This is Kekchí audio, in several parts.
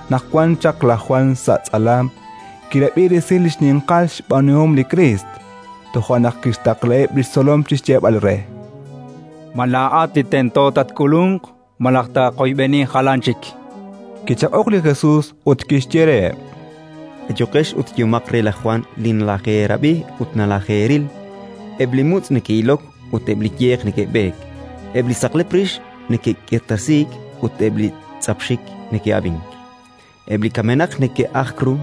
Naq wan chaq laj Jwan sa' tz'alam, kirab'i resil li xninqal xb'aanuhom li Kriist. Toja' naq kixtaqlaheb' li xtzolom chi xyeeb'al re: “Ma laa'at li tento taak'ulunq, malaj taaqoyb'eni jalan chik?”. Kichaq'ok li Jesus ut kixye reheb': “Ayuqex ut yehomaq re laj Jwan li nalajeerab'i ut nalajeeril. Eb' li mutz' neke'ilok ut eb' li yeq neke'b'eek, eb' li saqlep rix neke'k'irtasiik ut eb' li tz'ap xik neke'ab'ink, eb' li kamenaq neke'ajk ru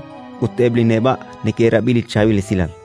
ut eb' li neb'a' neke'rab'i li Chaab'il Esilal.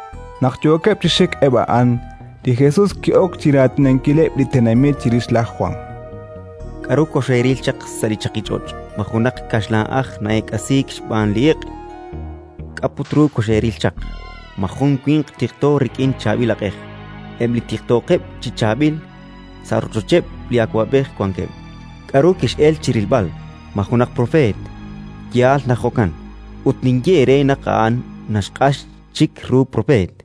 Naq yookeb' chi xik eb' a'an, li Jesus ki'ok chi raatinankileb' li tenamit chirix laj Jwan: “K'aru koxeeril chaq sa' li chaqich'och'? Ma jun li kaxlan'aj na'eek'asiik xb'aan li iq'? K'a' put ru koxeeril chaq? Ma jun li winq tiqto rik'in chaab'il aq'ej? Eb' li tiqtookeb' chi chaab'il, sa' rochocheb' li awab'ej wankeb'. K'aru kex'elk chi rilb'al? Ma junaq propeet? Yaal naq jo'kan; ut ninye eere naq a'an naxq'ax chik ru propeet.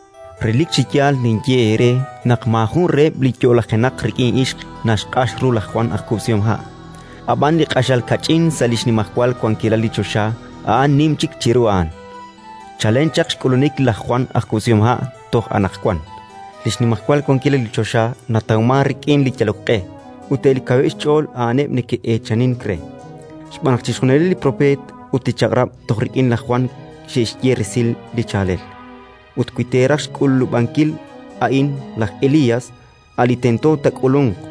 Relik chi yaal ninye eere naq maajun reheb' li yo'lajenaq rik'in ixq naxq'ax ru laj Jwan aj kub'sihomha'. Ab'an li q'axal kach'in sa' li xnimajwal wankilal li choxa, a'an nim chik chiru a'an. “Chalen chaq xk'ulunik laj Jwan aj kub'sihomha' toj anaqwan, li xnimajwal wankilal li choxa natawmank rik'in li yalok q'e; ut eb' li kaweb' xch'ool, a'aneb' neke'eechanink re: xb'aan naq chixjunileb' li Propeet ut li Chaq'rab' toj rik'in laj Jwan xe'xye resil li chaalel. Ut wi teeraj xk'ulub'ankil, a'in laj Elías, a' li tento taak'ulunq.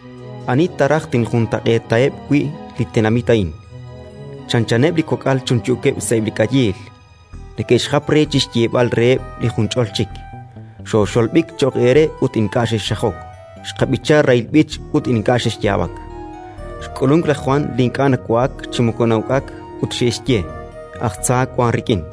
“Ani ta raj tinjuntaq'eetaheb' wi' li tenamit a'in? Chanchaneb' li kok'al chunchuukeb' sa'eb' li k'ayiil, neke'xjap re chi xyeeb'al reheb' li junch'ol chik: «Xooxolb'ik cho'q eere ut ink'a' xexxajok; xqab'icha rahil b'ich ut ink'a' xexyaab'ak». Xk'ulunk laj Jwan li ink'a' nawa'ak chi moko na'uk'ak, ut xe'xye: «Aj tza wank rik'in».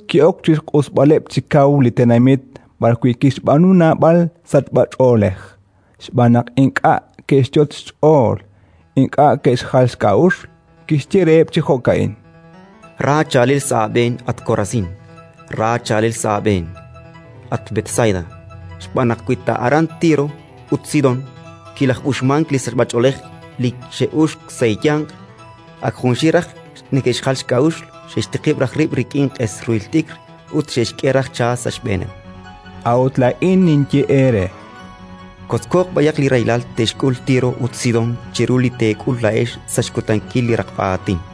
Toja' naq li Jesus ki'ok chi xq'usb'aleb' chi kaw li tenamit b'arwi' kixb'aanu naab'al sachb'ach'oolej, xb'aan naq ink'a' ke'xyot' xch'ool, ink'a' ke'xjal xk'a'uxl. Kixye reheb' chi jo'ka'in: “Ra chaalel sa' aab'een, at Korasín! Ra chaalel sa' aab'een, at Betsaida! Xb'aan naq wi ta aran Tiro ut Sidón kilaj'uxmank li sachb'ach'oolej li xe'uxk sa' eeyanq, ak junxil raj neke'xjal xk'a'uxl, xe'xtiqib' raj rib' rik'in q'es ruhil t'ikr ut xe'xk'e raj cha sa' xb'eeneb'. A'ut laa'in ninye eere: kotzko b'ayaq li rahilal te'xk'ul Tiro ut Sidón chiru li teek'ul laa'ex sa' xkutankil li raqb'a aatin.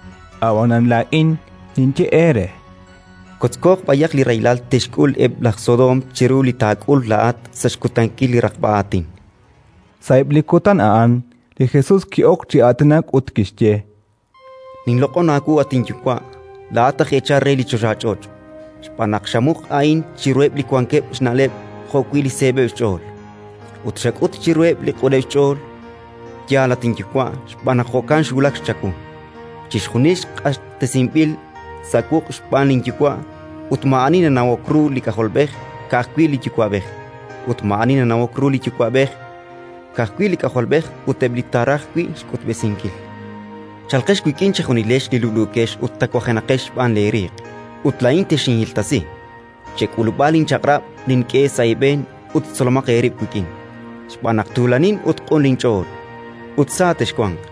Ab'anan laa'in ninye eere: kotzko b'ayaq li rahilal te'xk'ul eb' laj Sodoom chiru li taak'ul laa'at sa' xkutankil li raqb'a aatin”. Sa'eb' li kutan a'an li Jesus ki'ok chi aatinak ut kixye: “Ninloq'on aawu, at inYuwa', laa'at aj eechal re li choxach'och', xb'aan naq xamuq a'in chiruheb' li wankeb' xna'leb' jo'wi' li seeb'eb' xch'ool, ut xak'ut chiruheb' li q'uneb' xch'ool. Yaal, at inYuwa', xb'aan naq jo'kan xwulak chawu. “Chixjunil q'axtesinb'il sa' wuq' xb'aan linYuwa', ut maa'ani nanawok ru li K'ajolb'ej, ka'ajwi' li Yuwa'b'ej; ut maa'ani nanawok ru li Yuwa'b'ej, ka'ajwi' li K'ajolb'ej ut eb' li taaraj wi' xk'utb'esinkil. “Chalqex wik'in chejunilex li lub'luukex ut tawajenaqex xb'aan leeriiq, ut laa'in texinhiltasi. Chek'ulub'a linchaq'rab' nink'e sa' eeb'een ut tzolomaq eerib' wik'in, xb'aan naq tuulanin ut q'un linch'ool, ut sa texwanq.